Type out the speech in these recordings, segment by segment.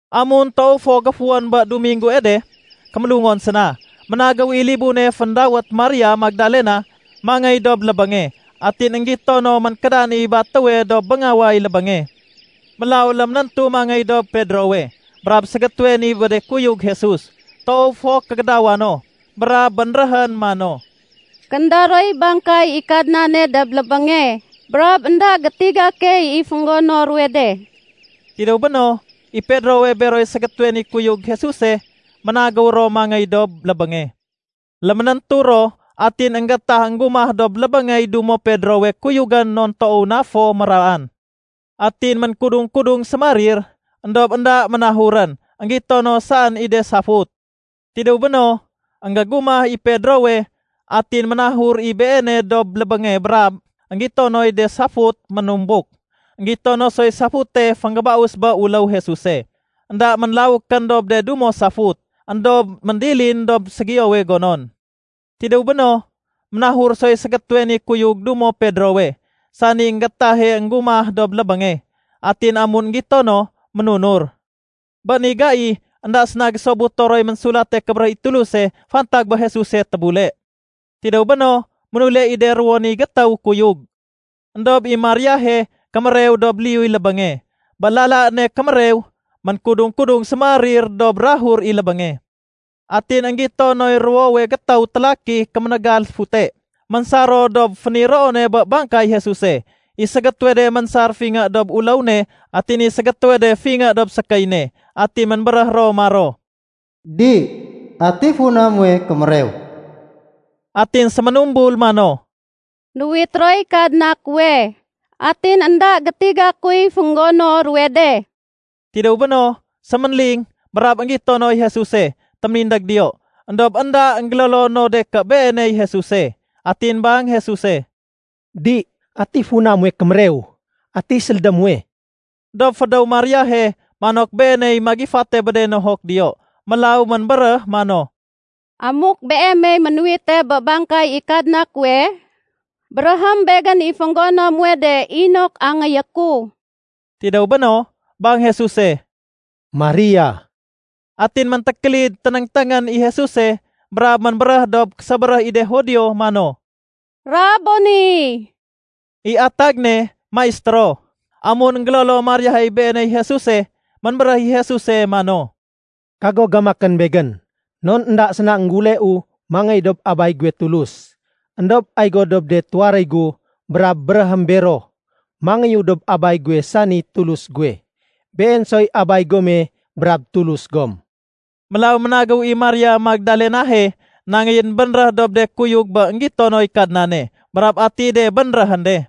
Amun toow fo géfuwén bé Duminggue de, kémélungon séna, ménagéw i libune féndawét Maria Magdalena mangéy dob lébénge. Atin énggito no ménkédan i batéwe dob béngaway lébénge. Mélaw léménéntu mangéy dob Pedrowe brab ségétéwe ni bé de kuyug Jesus toow fo kégédawa no. Brab bénréhén mano, “Kénda roy bangkay i Kadnane dob lébénge brab énda gétiga key i fénggono ruwe de.” Tidéw béno, i Pedrowe beroy ségétéwe ni kuyug Jesuse, ménagéw ro mangéy dob lébénge. Léménéntu ro atin énggétah énggumah dob lébéngey dumo Pedrowe kuyugén non toow na fo méraan. Atin ménkudung-kudung sémarir, éndob énda ménahurén. Enggito no saén i de safut. Tidéw béno, énggégumah i Pedrowe, atin ménahur i beene dob lébénge brab énggito noy de safut ménumbuk. Enggito no soy safute fénggébaus bé uléw Jesuse. Enda ménlawékén dob de dumo safut, éndob méndilin dob ségiyowe gonon. Tidéw béno, ménahur soy ségétéwe ni kuyug dumo Pedrowe, sani énggétahe énggumah dob lébénge. Atin amun énggito no, ménunur. Bé ni gai énda séna gésobuto roy Ménsulate Kébéréh i Tuluse fantag bé Jesuse tébule. Tidéw béno, ménule i de ruwo ni gétéw kuyug. Endob i Mariahe kémérew dob liyuy lébénge. Bé lala ne kémérew, ménkudung-kudung sémarir dob bukag i lébénge. Atin énggito noy ruwowe gétéw télaki kéménégal fute, ménsar ro dob féniroone bé bangkay Jesuse. I ségétéwe de ménsar fingé dob uléw ne atin i ségétéwe de fingé dob sékéy ne. Atin ménbéréh ro maro, “Di, ati funa muwe kémérew?” Atin séménumbul mano, “Nuwit roy Kadna kuwe atin énda gétiga kuy fénggono ruwe de.” Tidéw béno, séménling brab énggito noy Jesuse téménindég diyo, éndob énda énggélolo no de ké Beeney Jesuse. Atin bang Jesuse, “Di, ati funa muwe kémérew? Ati sélédé muwe?” Dob fédéw Mariahe manok beeney magifate bé de nohok diyo. Mélaw ménbéréh mano, “Amuk Beemey ménuwite bé bangkay i Kadna kuwe, béréhém begén i fénggono muwe de inok angéyé ku.” Tidéw béno, bang Jesuse, “Maria.” Atin méntékélid ténéngténgén i Jesuse brab ménbéréh dob késébéréh i de Judio mano, “Raboni!” (I atag ne Maistéro.) Amun énggélolo Mariahe Beeney Jesuse, ménbéréh i Jesuse mano, “Kago gamakén Begén, non énda séna énggéuleu mangéy dob Abay guwe Tulus. Endob ay go dob de tuwaréy gu brab béréhém bero, mangéyu dob Abay guwe sani Tulus guwe. Been soy Abay gome brab Tulus gom.” Mélaw ménagéw i Maria Magdalenahe nangéyén bénréh dob de kuyug bé énggito noy Kadnane brab ati de bénréhén de.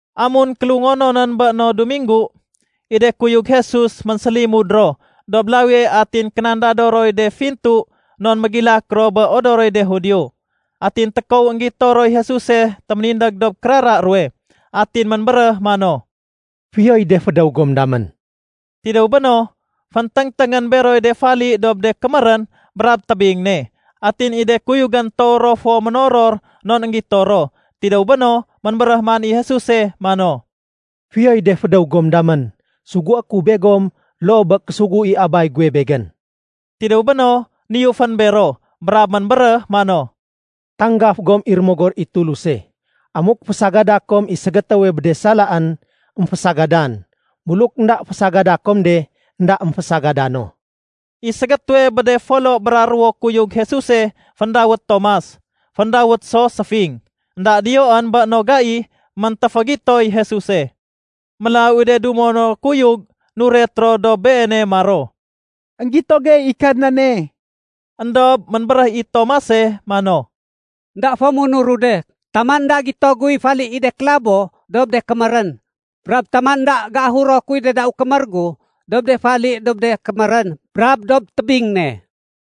Amun kélungononén bé no Duminggu, i de kuyug Jesus ménsélimud ro dob lawie atin kénandado roy de fintu non mégilak ro bé odoroy de Judio. Atin tékow énggito roy Jesuse téménindég dob kérara ruwe. Atin ménbéréh mano, “Fiyoy de fédéw gom damén.” Tidéw béno, fénténgténgén beroy de fali dob de kémérén brab tébing ne. Atin i de kuyugén toow ro fo ménoror non énggito ro. Tidéw béno, ménbéréh man i Jesuse mano, “Fiyoy de fédéw gom damén. Sugué ku begom loo bé késugu i Abay guwe Begén.” Tidéw béno, niyufén bero brab ménbéréh mano, “Tanggaf gom i Rémogor i Tuluse. Amuk fésagada kom i ségétéwe bé de salaén, émfésagadan. Buluk énda fésagada kom de, énda émfésagadan no.” I ségétéwe bé de folo bra ruwo kuyug Jesuse féndawét Tomas (féndawét so “Séfing”) énda diyoén bé no gai méntéfégitoy Jesuse. Mélaw i de dumo no kuyug nuret ro dob beene maro, “Enggito gey i Kadnane”. Endob ménbéréh i Tomase mano, “Enda fo munuru de taman énda gito guy fali i de kélabo dob de kémérén brab taman énda géahuro kuy de dau kémér gu dob de fali dob de kémérén brab dob tébing ne.”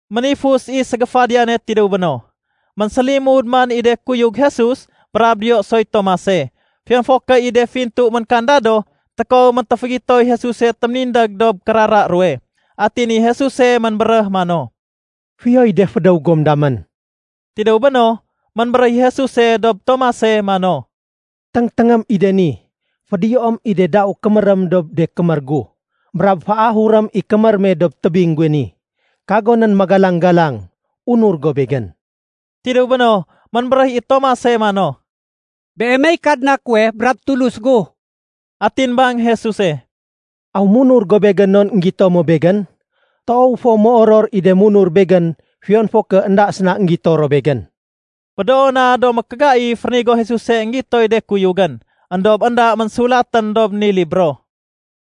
Ménifus i ségéfadiyane tidéw béno, ménsélimud man i de kuyug Jesus brab diyo soy Tomase. Fiyon fo ké i de fintu ménkandado, tékow méntéfégitoy Jesuse téménindég dob kérara ruwe. Atin i Jesuse ménbéréh mano, “Fiyoy de fédéw gom damén.” Tidéw béno, ménbéréh i Jesuse dob Tomase mano, “Téngténgém i de ni. Fédiyoém i de dau kémérém dob de kémér gu, brab féahurém i kémér me dob tébing guwe ni. Kagonén magalang-galang. Unur go Begén.” Tidéw béno, ménbéréh i Tomase mano, “Beemey Kadna kuwe brab Tulus gu.” Atin bang Jesuse, “Aw munur go Begén non énggito mo Begén? Toow fo méoror i de munur Begén fiyon fo ké énda séna énggito ro Begén.” Médoo na do mékégaif rénigo Jesuse énggitoy de kuyugén éndob énda ménsulatén dob ni libro.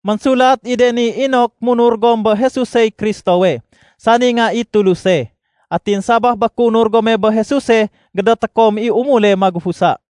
Ménsulat i de ni inok munur gom bé Jesusey Kristowe, sani Nga i Tuluse. Atin sabaf bé kéunur gome bé Jesuse gédoté kom i umule magufusa.